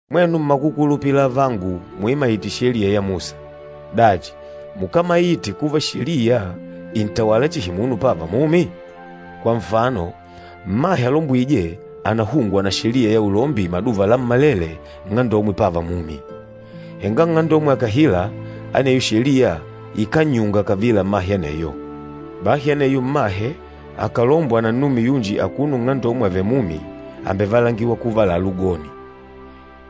Mwenu mmakukulupila avangu muimaîte Sheliya ya Musa, dachi mukámaite kuva Sheliya ìntawala chihi munu pava mumi? Kwa nfano, mmahe alombwîje ànahungwa na sheliya ya ulombi maduva lammalele nng'andomwe pava mumi, henga nng'andomwe akàhila, aneyo sheliya ikánnyunga kavila mmahe aneyo. Bahi aneyo mmahe akàlombwa na nnume yunji akuno nng'andomwe avèlè mumi, àmbevalangiwa kuva àlalá ugoni.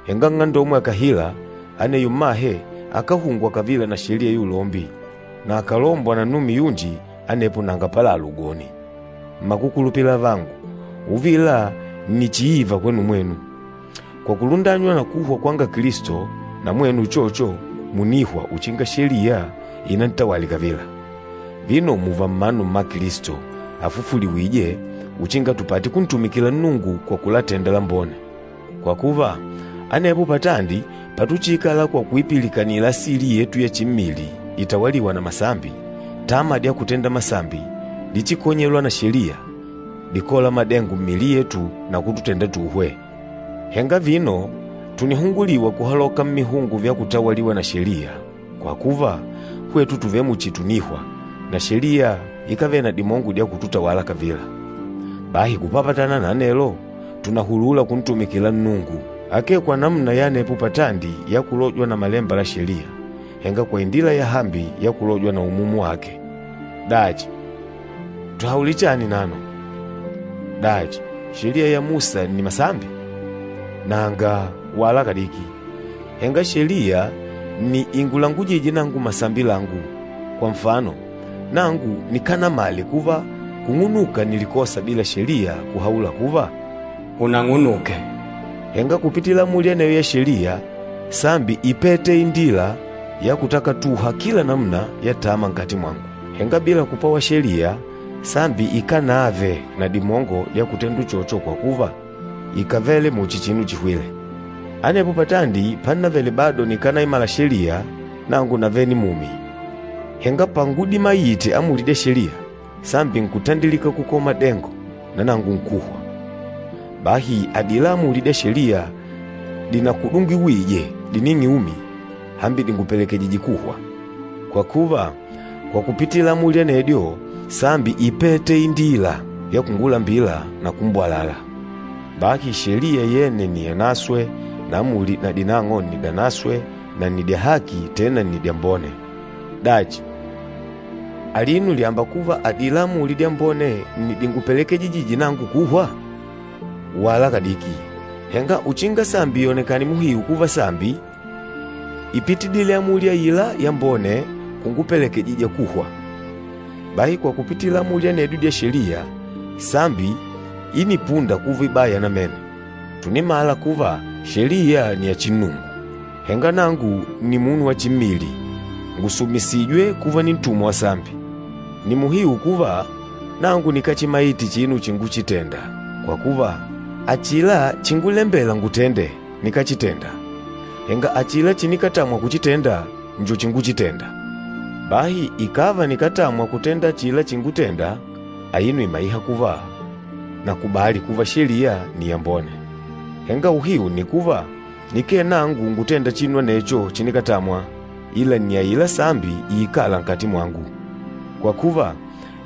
Henga nng'andomwe akàhila, aneyo mmahe akáhungwa kavila na sheliya ya ulombi, na akàlombwa na nnume yunji anepo nanga pálàlà ugoni. Mmakukulupila avangu, uvila nni chiiva kwenu mwenu. Kwa kulundanywa na kuhwa kwanga Kilisto, na mwenu uchocho mùnihwa uchinga Sheliya inantawale kavila. Vino mùùva mmanu mma Kilisto, afufuliwîje, uchinga tupate kuntumikila Nnungu kwa kulatenda lambone. Kwa kuva, anepo patandi patuchiikala kwa kuipilikanila asili yetu ya chimmili itawalîwa na masambi, tama dya kutenda masambi dichikonyêlwa na Sheliya, díkola madengo mmiili yetu na kututenda tuhwe. Henga vino, tùnihunguliwa kuhaloka mmihungo vya kutawaliwa na Sheliya, kwa kuva, hwetu tùvele muchi tùnihwa, na Sheliya ikávele na dimongo dya kututawala kavila. Bahi kupapatana na anelo, tùnahulula kuntumikila Nnungu, akee kwa namuna ya anepo patandi ya kulojwa na malemba la Sheliya, henga kwa indila yahambi ya kulojwa na Umumu wake. Dachi, tuhaule chani nano? Dachi, Sheliya ya Musa nni masambi? Nanga, wala kadiki! Henga, Sheliya nni ingulangujîje nangu masambi langu. Kwa nfano, nangu nikánamale kuva kung'unuka nni likosa bila Sheliya kuhaula kuva, “Unang'unuke.” Henga kupitila amuli aneyo ya Sheliya, sambi ípete indila ya kutakatuha kila namuna ya tama nkati mwangu. Henga bila kupwawa Sheliya, sambi ikánave na dimongo dya kutenda uchocho kwa kuva ikàvele muchi chinu chihwîle. Anepo patandi pannavele bado nikànaimala Sheliya, nangu navele nimumi. Henga pangudimaite amuli dya Sheliya, sambi nkutandilika kukola madengo, na nangu nkuhwa. Bahi adila amuli dya Sheliya dinakudungiwije dining'e umi, hambi dìngupelekejijije kuhwa. Kwa kuva, kwa kupitila amuli anedyo, sambi ípete indila ya kungulambila na kumbwalala. Bahi Sheliya yene nni yanaswe na amuli na dinang'o nni dyanaswe na nni dya haki, tena nni dyambone. Dachi, alino lyàmba kuva adila amuli dyambone nni dingupelekejijîje nangu kuhwa? Wala kadiki! Henga uchinga sambi yonekane muhiu kuva sambi, ípitidile amuli aila yambone kungupelekejija kuhwa. Bahi kwa kupitila amuli anedyo dya Sheliya, sambi ínipunda kuva ibaya namene. Tùnimala kuva Sheliya nni ya chinnungu, henga nangu nni munu wa chimmili, ngùsumisijwe kuva nintumwa wa sambi. Nni muhiu kuva nangu nikáchimaite chinu chinguchitenda, kwa kuva achila chíngulembèlà ngutende, nikáchitenda, henga achila chinikatamwa kuchitenda njo chinguchitenda. Bahi ikàva nikátamwa kutenda achila chingutenda, aino ìmaiha kuva nakubali kuva Sheliya nni yambone. Henga uhiu nni kuva, nikee nangu ngutênda chinu anecho chinikatamwa, ila nni aila sambi iikâla nkati mwangu. Kwa kuva,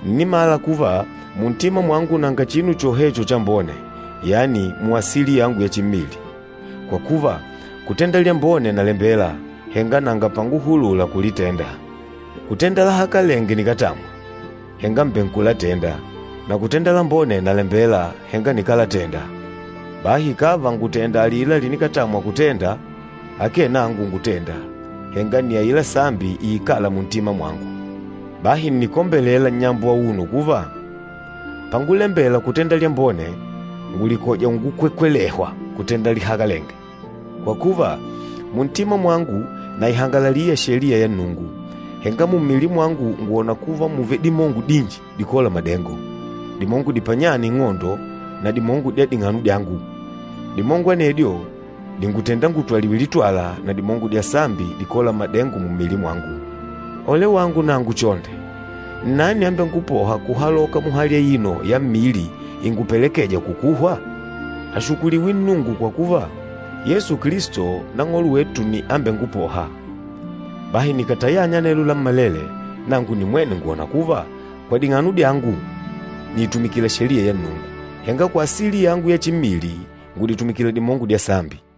ǹnimala kuva muntima mwangu nanga chinu chohecho chambone, yani muasili yangu ya chimmili. Kwa kuva, kutenda lyambone nalembela, henga nanga panguhulula kulitenda. Kutenda lahakalenge nikátamwa, henga mbènkulatenda, na kutenda lambone nalembela, henga nikálatenda. Bahi ikàva ngùtenda alila linikatamwa kutenda, akee nangu ngutênda, henga nni aila sambi iikâla muntima mwangu. Bahi ǹnikombelela nnyambo auno kuva, pangulembela kutenda lyambone, ngùlikoja ungukwekwelehwa kutenda lihakalenge. Kwa kuva, muntima mwangu naihangalalila Sheliya ya Nnungu, henga mummili mwangu ngwòna kuva mùvele dimongo dinji dikôla madengo, dimongo dipanyâna ing'ondo na dimongo dya ding'ano dyangu. Dimongo anedyo dìngutenda ngutwaliwe litwala na dimongo dya sambi dikôla madengo mummili mwangu. Ole wangu nangu chonde! Nnani ambengupôha kuhaloka muhali aino ya mmili ingupelekêja kukuhwa? Ashukuliwe Nnungu kwa kuva, Yesu Kilisto Nang'olo wetu nni ambengupôha! Bahi nikàtayanya anelo lammalele, nangu nimwene ngwòna kuva, kwa ding'ano dyangu nìitumikila Sheliya ya Nnungu, henga kwa asili yangu ya chimmili ngùditumikila dimongo dya sambi.